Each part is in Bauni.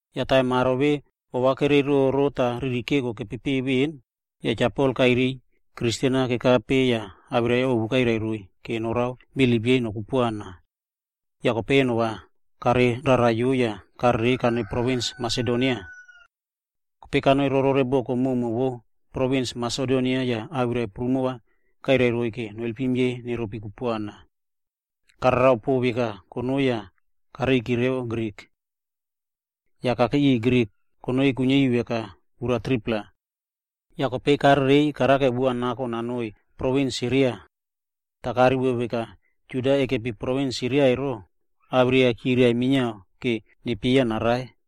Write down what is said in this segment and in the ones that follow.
Yah taim aro vemona ova kereiroro tah riri keko emo keturepiki veꞌen, yah Cha Pol kairiy Kristen-a kekape yah awirai-a ovu kairai roiy vora norao bilip yei nokupuana. Yah kope eno-a kareiꞌrarai yah karerei tah kanoi provins Masedonia. Kope kanoi boko koka vo provins Masedonia tah awirai prumo kairai roiy vora noalpim yei neropi kupuana. Karao karara pon veka konoi yah kareiki revo Grik. Yah kakei riꞌiy Grik konoi kuiniari veka ura 3-pla. Yah kope, karerei yah karao sip-a nako va nanoi provins Siria. Toh karivo veka aro Juda kekepi provins Siria emo, awirai-a chirai minia va nepieya narai.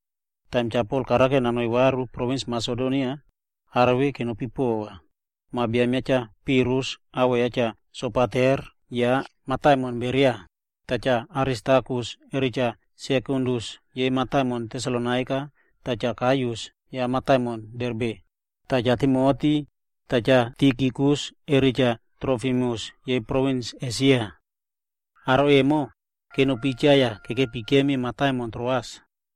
Taim Cha Pol karao nanoi varu provins Masedonia, aro vemona emo kenopi pova: Ma biam ya Cha Pirus awoꞌo ya Cha Sopater ya mataimon Beria, yah Cha Aristarkus re Cha Sekundus yei mataimon Tesalonaika yah Cha Gaius ya mataimon Derbe, tah Cha Timoti, yah Tikikus re Cha Trofimus yei provins Esia. Aro vemona emo kenopi cha yah kekepi kekemib mataimon Troas.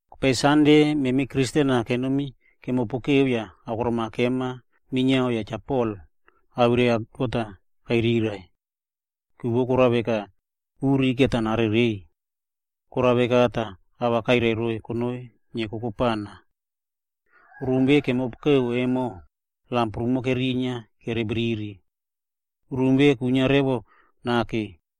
Kope Sande, memi aro Kristen-a kenomi kemopokeu yah akorom-a kema minia tah Cha Pol awirai ya God-a kairiraiꞌvo. Ku vo korao veka, kope uri va narereiy. Korao veka tah ava kairai roiy konoi nieko kopana. Rum vemona kemopokeu emo, lam prumo kerinia kerebriri. Rum vemona kwinia revo nake.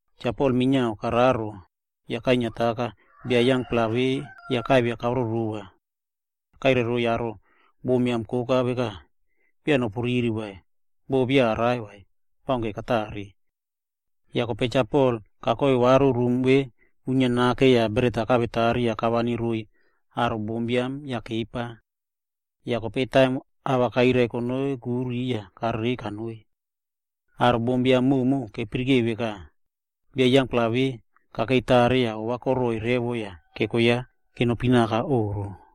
Cha Pol minia kararo, yah kainiataka bia yangpla vemona yah kavia karoroa. Yah kairai roiy aro bombiam koka veka, “Beya nopu riri vai, boh beya karai vai, baunke katare.” Yah kope Cha Pol kakoi varu rum vemona kwinia nake emo tah bret-a kakorari yah kavani roiy aro bombiam yah kepa. Kope taim ava kairai konoi kuri, yah karereiy yah kanoi. Aro bombiam koka emo kepirike veka, bia yangpla vemona kakei tare tah ova koroi revo yah keko ya kenopi oꞌro.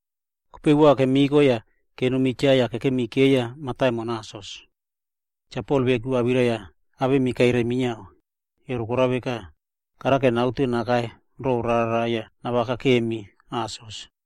Kope sip-a kemiko tah kenomi cha yah kekemi keiya mataimon Asos. Cha Pol veku awirai-a katiti rimi minia, emo korao veka, karao naute nakai ro rara yah navakakemi mataimon Asos.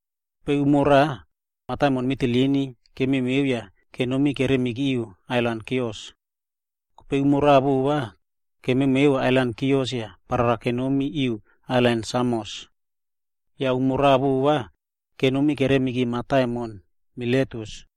Kope umo raꞌa, mataimon Mitilini emo kememeu yah kenom keremiki ailan Kios. Tah kope umo raꞌa vova, ailan Kios emo kememeu yah kemi parara kenomi ailan Samos. Yah umo raꞌa vova, kenomi keremiki mataimon Miletus.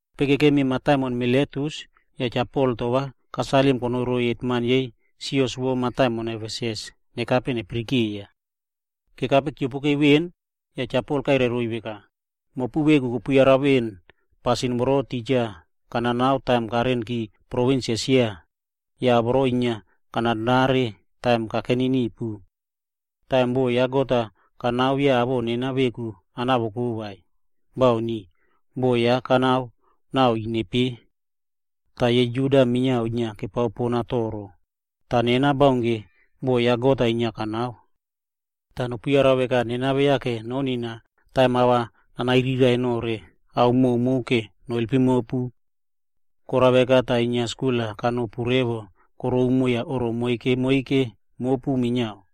Kope kekemi mataimon Miletus tah Cha Pol to-a kasalim konoi roiy aro hetman vo sios vo mataimon Efesus va nekape neyaraka. Kekape kiopoke veꞌen, yah Cha Pol kairai roiy veka, “Mopu veku kopu save veꞌen pasin vemona titja kanao emo taim kana kamap provins Esia, yah ao vemona inia kanao taim kakeni nipu. Taim boꞌo ya God-a kanao beya awoꞌo nena veku kanavoko vai, bauni, nena boꞌo ya kanao nao ine pe. Tah yei Juda minia inia kepao pona toro, toh nena baunke boꞌo ya God-a inia kanao. Yah va nopu yara veka nena beya konina taim ava kanairiraiꞌvo nore ao koka va noalpim mopu. Korao veka tah kana save skul-a kanopu vatiron yah oꞌro moike moike mopu minia.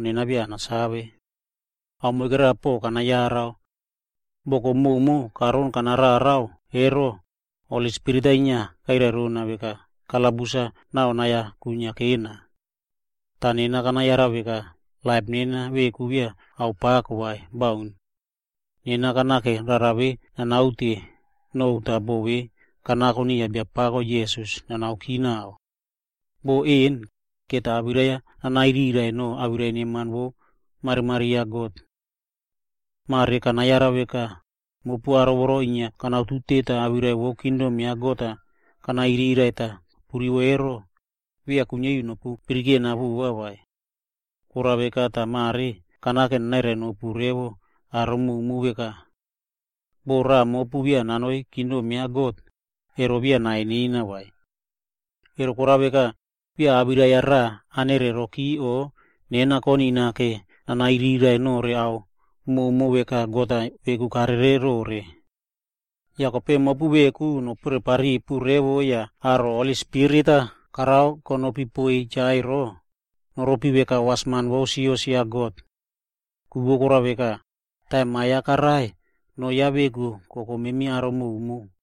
Nena ao moikera pon kana yara. Boko koka karon kanarara emo, Holi Spirit-a inia kwirai rona veka kalabus tah nai-a kwinia kekena. Toh kope kana yara veka laip nena veku beya korao veka ao pako vai. Bauni. Nena kanao nanaute no rara vemona kanaute no vemo yah boꞌo vemona kanako niya Biapako Jisas nanaoki naꞌao. Boꞌo emo va awirai nanairaiꞌvo no awirai neman vo marimari ya God. “Mare kana save veka, mopu aro voro inia kanautute tah awirai vo kingdom ya God-a kanairiraiꞌvo kopu rivo ero, beya kuiniari nopu yarana vova vai. Korao veka tah mare kanao nanairai nopu revo aro koka veka. Boh raꞌa mopu beya nanoi kingdom ya God, ero beya nai nena vai. Emo korao veka, nena beya awirai-a rava kanereroki o konina ro awirai-a nanairiraiꞌvo nore ao koka veka God-a veku karerero. Yah kope nopore paripu revo mopu veku yah mopu aro Holi Spirit-a korao konopi poiy cha ero, noropi veka wasman ya God. Ku vo korao veka, taim ma ya karai, noo ya veku kobaim memi aro koka.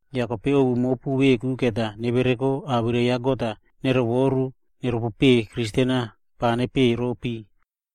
Yah kope ovu mopu veku va nevereko tah awirai ya God-a nerovoru yah neropopei Kristen-a pava nepekeiy.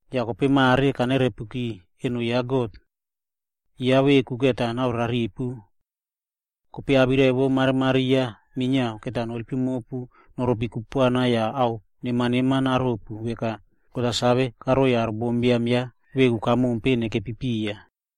“Yah kope mare kanerepuki noa eno ya God. Ya veku va naore raripu. Kope awirai vo marimari ya minia va noalpim mopu vora noropi kupuana tah va ao neman neman naropu veka God-a kasave karoi aro bombiam ya veku kamompe nekepi piya.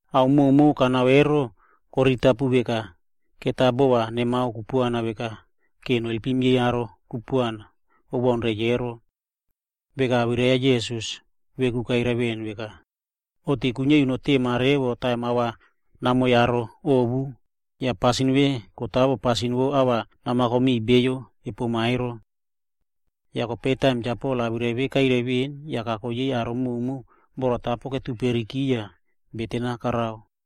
Ao koka kanao emo, ero koriritapu veka, memi va bova nemao kupuana veka, vora noalpim yei aro kupuana kobaun reiy ero. Veka awirai ya Jisas veku kairai veꞌen veka, ‘Oꞌto-a kuiniari notema poaka taim ava namiꞌiy aro ovu, yah pasin vemona kotawo pasin vo ava namako miꞌiy beyo kepoma ero.’” Kope taim Cha Pol awirai vemona kairaiki veꞌen, yah kako yei aro koka emo oku ketuperiki yah Cha Pol beten-a karao.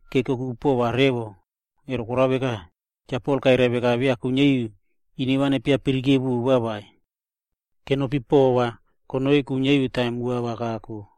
Yah keokoku pova revo, ku vo koraka, Cha Pol kairai veka beya kuiniari ine nepia yara vova vai. Kenopi pova konoi kuiniari taim sip-a kako.